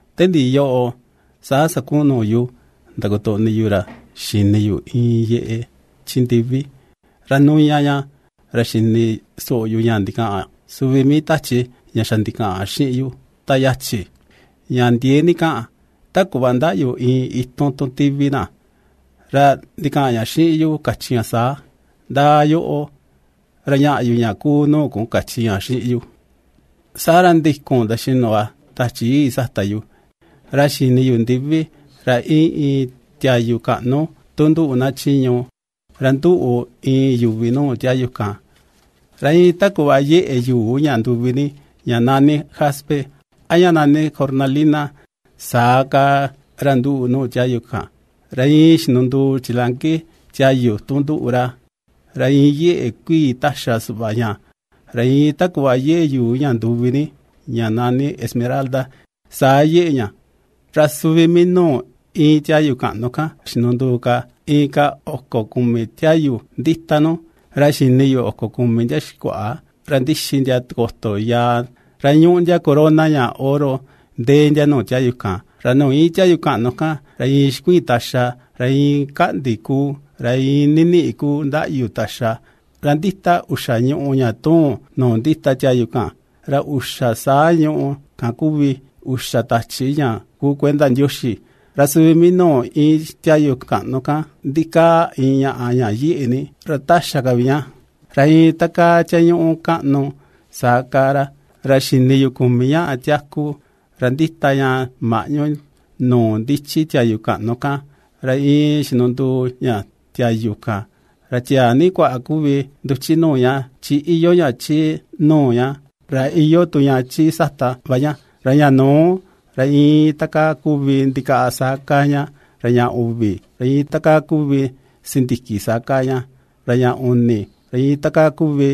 Te ndiꞌi yoꞌo, saa sakuꞌun nuu yu ndakotoꞌni yu ra xini yu iin yeꞌe chi ndivi, ra nuña ña, ra xini soꞌo yu ña ndikaꞌan suvi mii tachi ña xa ndikaꞌan xiꞌin yu ta yachi, ña ndiee ni kaꞌan, ta kuꞌva ndaꞌyu iin itun tu tivi na, ra ndikaꞌan ña xiꞌin yu kachi ña saa: ―Ndaa yoꞌo ra ñaꞌa yu ña kuu nuu kun ―kachi ña xiꞌin yu. Saa ra ndikun nduxinu va Tachi Yii sata yu, ra xini yu ndivi ra íin iin tiayu kaꞌnu tu nduꞌu na chiñu, ra nduꞌu iin yuvi nuu tiayu kan. Ra iin ta kuꞌva yeꞌe yuu ña nduvi ni ña nani jaspe, a ña nani cornalina, saa kaa ra nduꞌu nuu tiayu kan, ra iin xinunduu chilanki tiayu tu nduꞌu ra, ra iin yeꞌe kuii ^taxa suꞌva ña, ra iin ta kuꞌva yeꞌe yuu ña nduvi ni ña nani esmeralda, saa yeꞌe ña. Ra suvi mii nuu íin tiayu kaꞌnu kan xinunduu ka inka oko kumi tiayu ndita nu, ra xini yu oko kumi ndia xikuaꞌa ra ^ndixi ndia tikoto yaa, ra ^ñuꞌu ndia corona ña oro ndee ndia nuu tiayu kan. Ra nuu íin tiayu kaꞌnu kan ra iin xikuiin taxa, ra iin kaꞌndi kuu, ra iin niniꞌi kuu ndaꞌyu taxa, ra ^ndita uxa ñùꞌù ña ^tuun nuu ndita tiayu kan; ra uxa saa ñuꞌu kan kuvi uxa Tachi ña kuu kuenda Ndioxi. Ra suvi mii nuu íin tiayu kaꞌnu kan ndikaa iin ñaꞌa ña yeꞌe ni ra taxa ka vi ña, ra iin ta kaa tiañuꞌu kaꞌnu, saa kaa ra. Ra xini yu kumi ña tiaku ra ^ndita ña maꞌñu nuu ndichi tiayu kaꞌnu kan, ra iin xinunduu ña tiayu kan. Ra tiaa ni kuaꞌa kuvi nduchi nuu ña chi iyoo ña chi nuu ña, ra iyoo tu ña chi sata va ña. Ra ña nuu, ra iin takaa kuvi iin ndikaꞌa, saa kaa ña; ra ña uvi, ra iin takaa kuvi sindiki, saa kaa ña; ra ña uni, ra iin takaa kuvi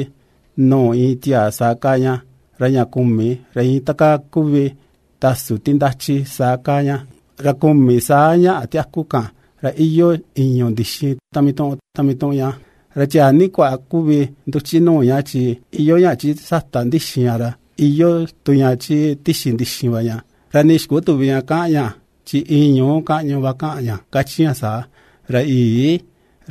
nuu iin tiaa, saa kaa ña; ra ña kumi, ra iin ta kaa ku vi iin tasu ti ndachi saa kaa ña. Ra kumi saa ña tiaku kan, ra iyoo ìñu̱ ndixin ta mituꞌun, ta mituꞌun ña, ra tiaa ni kuaꞌa kuvi nduchi nuu ña chi iyoo ña chi sata ndixin ña, ra iyoo tu ña chi tixi ndixin va ña; ra nii xikutüvi ña ña kaꞌan ña, chi iin ñuu kaꞌñu va kaꞌan ña kachi ña saa: ¡Ra Yii,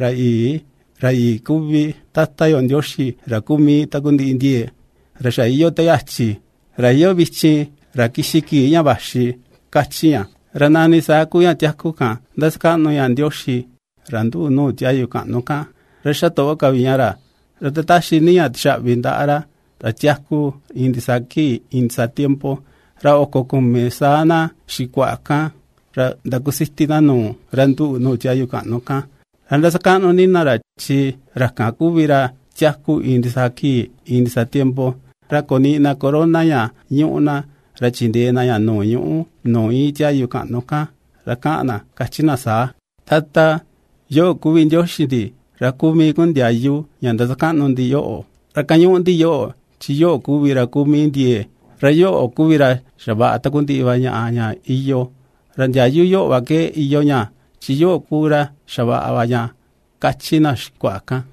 Ra Yii, Ra Yii kuvi Tata yo Ndioxi ra kuu mii takundiꞌi ndiee, Ra xa iyoo te yachi, Ra iyoo vichin, Ra kixi kii ña vaxi!, kachi ña. Ra nani saa kuu ña tiaku kan ^ndasakaꞌnu ña Ndioxi, ra ^nduꞌu nuu tiayu kaꞌnu kan, ra ^xatoꞌo ka vi ña ra, ra ^ndataxi ni ña tixaꞌvi ndaꞌa ra, ra tiaku iin ndisaa kii iin ndisaa tiempo. Ra oko kumi saa na xikuaꞌa kan, ra ^ndakusiti na nuu ra nduꞌu nuu tiayu kaꞌnu kan, ra ^ndasakaꞌnu ni na ra, chi ra kan kuvi ra tiaku iin ndisaa kii iin ndisaa tiempo, ra ^koniꞌi na corona ña ñuꞌu na, ra ^chindee na ña nuu ñuꞌú nuu íin tiayu kaꞌnu kan, ra kaꞌan na kachi na saa: Tata, yoꞌo kuvi Ndioxi ndi, ra kuu mii kun ndiayu ña ^ndasakaꞌnu ndi yoꞌo, ra ^kañuꞌu ndi yoꞌo, chi yoꞌo kuvi ra kuu mii ndiee, ra yoꞌo kuvi ra xavaꞌa takundiꞌi va ñaꞌa ña iyoo, ra ndiayu yoꞌo ke iyoo va ña, chi yoꞌo ku ra xavaꞌa va ña, ^kachi na xikuaꞌa kan.